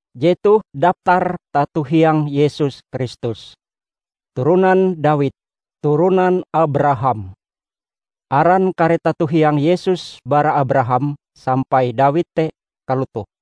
Jetoh daptar tato hiang Yesus Kristus, Turonan Dawid, Turonan Abraham. Aran kare tato hiang Yesus bara Abraham sampai Dawid te kalotoh: